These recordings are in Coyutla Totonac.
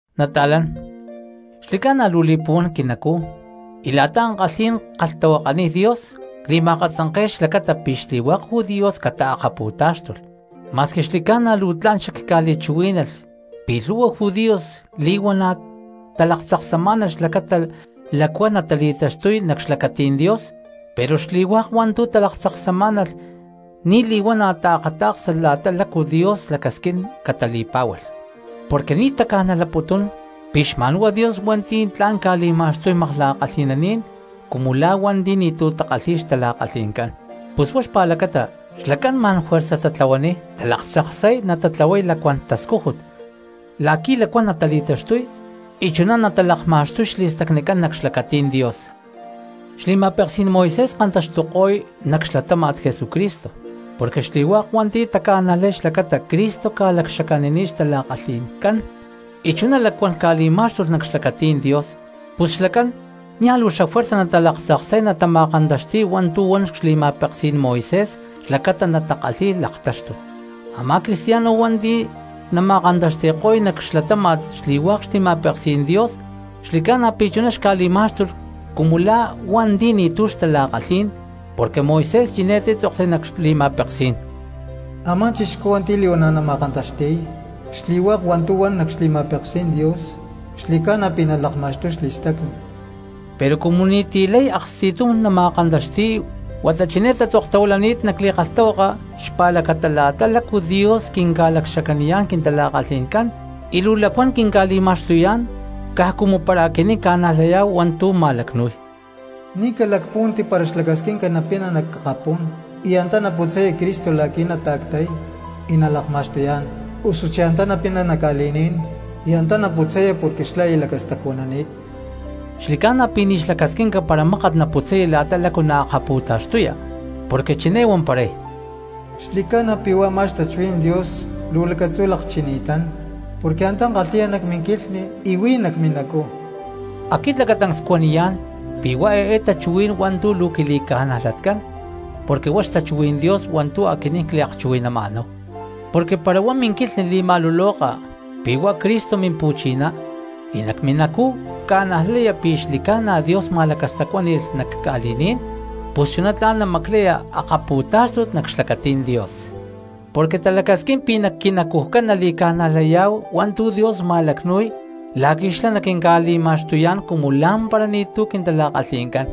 Nata̠lán, xli̠cána luu li̠puhuán quinacú, y la̠ta ankalhí̠n ckalhtahuakaniy Dios cli̠ma̠katzanke̠y xlacata pi̠ xli̠hua̠k judíos xtalaktáxtulh. Ma̠squi xli̠ca̠na luu tla̠n xacca̠li̠chuhuí̠nalh pi̠ lhu̠hua judíos li̠huana̠ talaktzaksamá̠nalh xlacata lacuán cristianos natali̠taxtuy nac xlacatí̠n Dios, pero xli̠hua̠k hua̠ntu̠ talaktzaksamá̠nalh ni̠ li̠huana̠ taakata̠ksa la̠ta lácu Dios lacasquín catali̠pá̠hualh. Porque ni̠ taca̠najlaputún pi̠ xma̠nhuá Dios hua̠nti̠ tla̠n ca̠li̠ma̠xtuy makla̠kalhi̠naní̠n cristianos cumu la̠ hua̠nti̠ ni̠tu̠ takalhi̠y xtala̠kalhi̠ncán, pus huá xpa̠lacata xlacán ma̠n juerza tatlahuaniy talaktzaksay natatlahuay lacuán tascújut la̠qui̠ lacuán cristianos natali̠taxtuy y chuná natalakma̠xtuy xli̠stacnicán nac xlacatí̠n Dios. Xli̠ma̠peksí̠n Moisés kantaxtuko̠y nac xlatáma̠t Jesucristo, porque xli̠hua̠k hua̠nti̠ taca̠najlay xlacata Cristo ca̠lacxacanini̠t xtala̠kalhi̠ncán y chuná lacuán cristianos ca̠li̠má̠xtulh nac xlacatí̠n Dios, pus xlacán niaj luu xafuerza natalaktzaksay natama̠kantaxti̠y hua̠ntu̠ huan xli̠ma̠peksí̠n Moisés xlacata natakalhíy laktáxtut. Amá cristiano hua̠nti̠ nama̠kantaxti̠ko̠y nac xlatáma̠t xli̠hua̠k xli̠ma̠peksí̠n Dios xli̠ca̠na pi̠ chuná xca̠li̠má̠xtulh cumu la̠ lacuán cristiano hua̠nti̠ ni̠tu̠ kalhi̠y xtala̠kalhí̠n, porque Moisés chiné títzokli nac xli̠ma̠peksí̠n: “Amá cristiano hua̠nti̠ li̠huana̠ nama̠kantaxti̠y xli̠hua̠k hua̠ntu̠ huán nac xli̠ma̠peksí̠n Dios xli̠ca̠na pi̠ nalakma̠xtuy xli̠stacni.” Pero cumu ni̠ti̠ lay aksti̠tum nama̠kantaxtiy huata chiné tatzoktahuilani̠t nac li̠kalhtahuaka xpa̠lacata la̠ta lácu Dios quinca̠lacxacaniyá̠n quintala̠kalhi̠ncán y quinca̠li̠ma̠xtuyá̠n lacuán cristianos caj cumu para aquinín ca̠najlayá̠hu hua̠ntu̠ ma̠lacnúy: “Ni̠ calacpúhuanti para xlacasquinca napina nac akapú̠n y antá naputzaya Cristo la̠qui̠ nata̠ctay y nalakma̠xtuyá̠n, osuchí antá napina nac ca̠li̠ní̠n y antá naputzaya porque xlá aya lacastacuanani̠t.” Xli̠ca̠na pi̠ ni̠ xlacasquinca para mákat naputzaya la̠ta lácu tla̠n nalaktaxtuya, porque chiné huamparay: “Xli̠ca̠na pi̠ huá a̠má xtachuhuí̠n Dios luu lacatzú lakchini̠tán, porque antá kalhi̠ya nac minquilhni y huí nac minacú.” Aquit lacatancs cuaniyá̠n pi̠ huá eé tachuhuí̠n hua̠ntu̠ luu quili̠ca̠najlatcán porque huá xtachuhuí̠n Dios hua̠ntu̠ aquinín cliakchuhui̠nama̠náhu. Porque para huá minquilhni li̠ma̠luloka pi̠ huá Cristo Mimpu̠chiná y nac minacú ca̠najlaya pi̠ xli̠ca̠na Dios ma̠lacastacuáni̠lh nac ca̠li̠ní̠n, pus chuná tla̠n namaclaya laktáxtut nac xlacatí̠n Dios. Porque talacasquín pi̠ huá minacujcán nali̠ca̠najlayá̠hu hua̠ntu̠ Dios ma̠lacnu̠y la̠qui̠ xlá naquinca̠li̠ma̠xtuyá̠n cumu lá̠mpara ni̠tu̠ quintala̠kalhi̠ncán,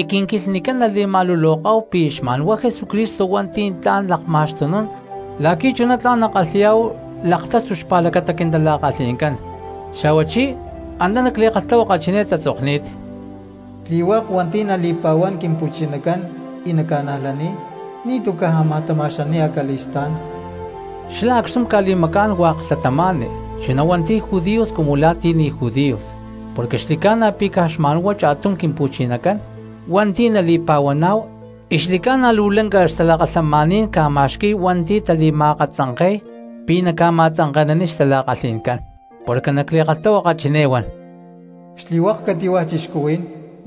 y quinquilhnicán nali̠ma̠luloká̠hu pi̠ xma̠nhuá Jesucristo hua̠nti̠ tla̠n lakma̠xtunún la̠qui̠ chuná tla̠n nakalhi̠yá̠hu laktáxtut xpa̠lacata quintala̠kalhi̠ncán. Xa̠huachí antá nac li̠kalhtahuaka chiné tatzokni̠t: “Xli̠hua̠k hua̠nti̠ nali̠pa̠huán Quimpu̠chinacán y naca̠najlaniy ni̠tu̠ caj ámaj tama̠xani̠y acali̠stá̠n.” Xlá acxtum ca̠li̠macá̠n hua̠k cristianos, chuná hua̠nti̠ judíos cumu la̠ ti̠ ni̠ judíos; porque xli̠ca̠na pi̠ caj xma̠nhuá cha̠tum Quimpu̠chinacán, hua̠nti̠ nali̠pa̠huaná̠hu y xli̠ca̠na luu lanca xtalakalhamaní̠n ca̠ma̠xqui̠y hua̠nti̠ tali̠ma̠akatzanke̠y pi̠ naca̠ma̠tzanke̠naniy xtala̠kalhí̠ncán. Porque nac li̠kalhtahuaka chiné huan: “Xli̠hua̠k cati̠hua̠ cristianos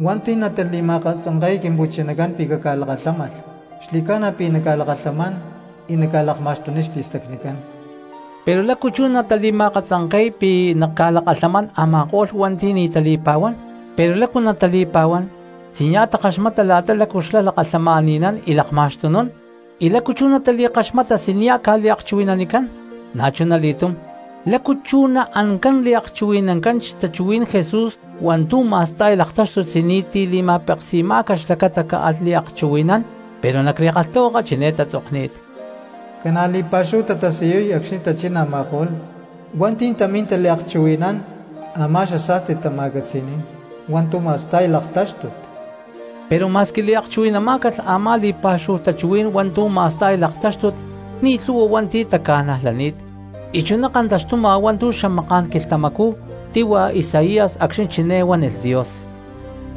hua̠nti̠ natali̠ma̠katzanke̠y Quimpu̠chinacán pi̠ caca̠lakalhámalh, xli̠ca̠na pi̠ naca̠lakalhamán y naca̠lakma̠xtuniy xli̠stacnicán.” Pero ¿lácu chú natali̠ma̠akatzanke̠y pi̠ naca̠lakalhamán a̠ma̠ko̠lh cristianos hua̠nti̠ ni̠ tali̠pa̠huani̠t? Pero ¿lácu natali̠pa̠huán si nia̠ takaxmata la̠ta lácu xlá lakalhamani̠nán y lakma̠xtunún? Y ¿lácu chú natali̠kaxmata si nia̠ ca̠liakchuhui̠nanicán? Na̠chunali̠túm, ¿lácu chú naancán liakchuhui̠nancán xtachuhuí̠n Jesús hua̠ntu̠ ma̠sta̠y laktáxtut si ni̠ti̠ li̠ma̠peksi̠má̠calh xlacata caalh liakchuhui̠nán? Pero nac li̠kalhtahuaka chiné tatzokni̠t: “Ca̠na̠ li̠pa̠xúhu tatasiyuy acxni̠ tachín a̠ma̠ko̠lh hua̠nti̠ tamín taliakchuhui̠nán a̠má xasa̠sti tama̠catzi̠ní̠n hua̠ntu̠ ma̠sta̠y laktáxtut.” Pero ma̠squi liakchuhui̠namá̠calh a̠má li̠pa̠xúhu tachuhuí̠n hua̠ntu̠ ma̠sta̠y laktáxtut ni̠ lhu̠hua hua̠nti̠ taca̠najlani̠t, y chuná kantaxtuma hua̠ntu̠ xamaká̠n quilhtamacú tíhua Isaías acxni̠ chiné huánilh Dios: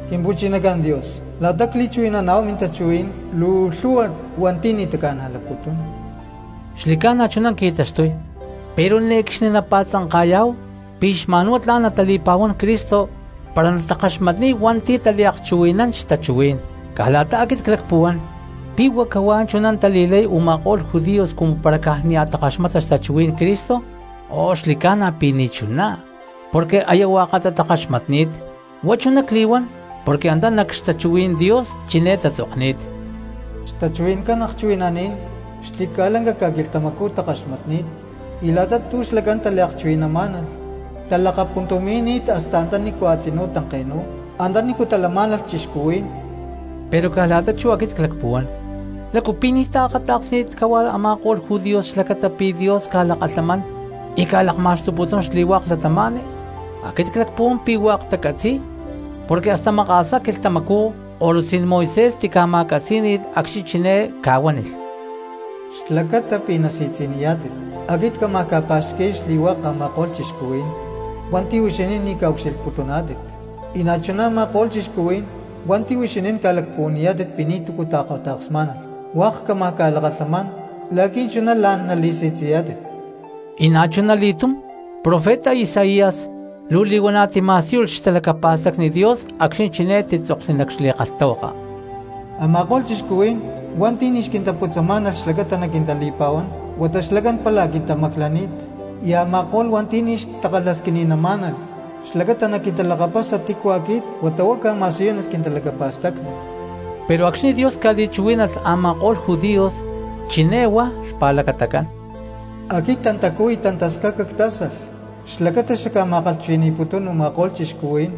“Quimpu̠chinacán Dios, la̠ta cli̠chuhui̠nán mintachuhuí̠n luu lhu̠hua hua̠nti̠ ni̠ taca̠najlaputún.” Xli̠ca̠na chuná qui̠taxtuy pero ne̠cxni napa̠tzanka̠yá̠hu pi̠ cristianos xma̠nhuá tla̠n natali̠pa̠huán Cristo para natakaxmatniy hua̠ntu̠ taliakchuhui̠nán xtachuhuí̠n. Caj la̠ta aquit clacpuhuán: ¿Pi̠ huá cahuá chuná tali̠lay u̠ma̠ko̠lh judíos cumu para caj nia̠ takaxmata xtachuhuí̠n Cristo? ¡Oh, xli̠ca̠na pi̠ ni̠chuná, porque aya hua̠katá takaxmatni̠t! Huá chuná cli̠huán porque antá nac xtachuhuí̠n Dios chiné tatzokni̠t: Xtachuhui̠ncán akchuhui̠naní̠n xli̠ca̠lanca ca̠quilhtamacú kaxmatcani̠t, y la̠ta tu̠ xlacán taliakchuhui̠namá̠nalh talakapuntumi̠ni̠t hasta antanícu a̠tzinú tanke̠nu̠y antanícu talamá̠nalh cristianos. Pero caj la̠ta chú aquit clacpuhuán: ¿Lácu pi̠ ni̠ taakata̠ksni̠t cahuá a̠ma̠ko̠lh judíos xlacata pi̠ Dios ca̠lakalhamán y ca̠lakma̠xtuputún xli̠hua̠k cristianos? Aquit clacpuhuán pi̠ hua̠k tacatzi̠y, porque hasta maka̠sá quilhtamacú ko̠lutzí̠n Moisés tica̠ma̠catzí̠ni̠lh acxni̠ chiné ca̠huánilh: Xlacata pi̠ nasi̠tzi̠niyá̠tit, aquit cámaj ca̠pa̠xqui̠y xli̠hua̠k a̠ma̠ko̠lh cristianos hua̠nti̠ huixinín ni̠ ca̠ucxilhputuná̠tit; y na̠chuná a̠ma̠ko̠lh cristianos hua̠nti̠ huixinín ca̠lacpuhuaniyá̠tit pi̠ ni̠túcu taakata̠ksmá̠nalh, hua̠k cámaj ca̠lakalhamán la̠qui̠ chuná la̠n nali̠si̠tzi̠yá̠tit. Y na̠chuna li̠túm profeta Isaías luu li̠huana̠ tima̠síyulh xtalacapa̠stacni Dios acxni̠ chiné títzokli nac xlibro: Ama̠ko̠lh cristianos hua̠nti̠ ni̠ xquintaputzamá̠nalh xlacata naquintali̠pa̠huán, huata xlacán pála quintamaclani̠t; y a̠ma̠ko̠lh hua̠nti̠ ni̠ xtakalhasquini̠namá̠nalh xlacata naquintalakapasa tícu aquit, huata huá cca̠ma̠siyúnilh quintalacapa̠stacni. Pero acxni̠ Dios ca̠li̠chuhuí̠nalh a̠ma̠ko̠lh hua̠nti̠ judíos, chiné huá xpa̠lacatacán: “Aquit tantacú y tantascaca ctzáksalh xlacata xacca̠ma̠kalhchuhui̠ni̠putún u̠ma̠ko̠lh cristianos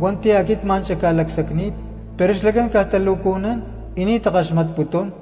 hua̠nti̠ aquit ma̠n xacca̠lacsacni̠t, pero xlacán caj talo̠cujnún y ni̠ takaxmatputún.”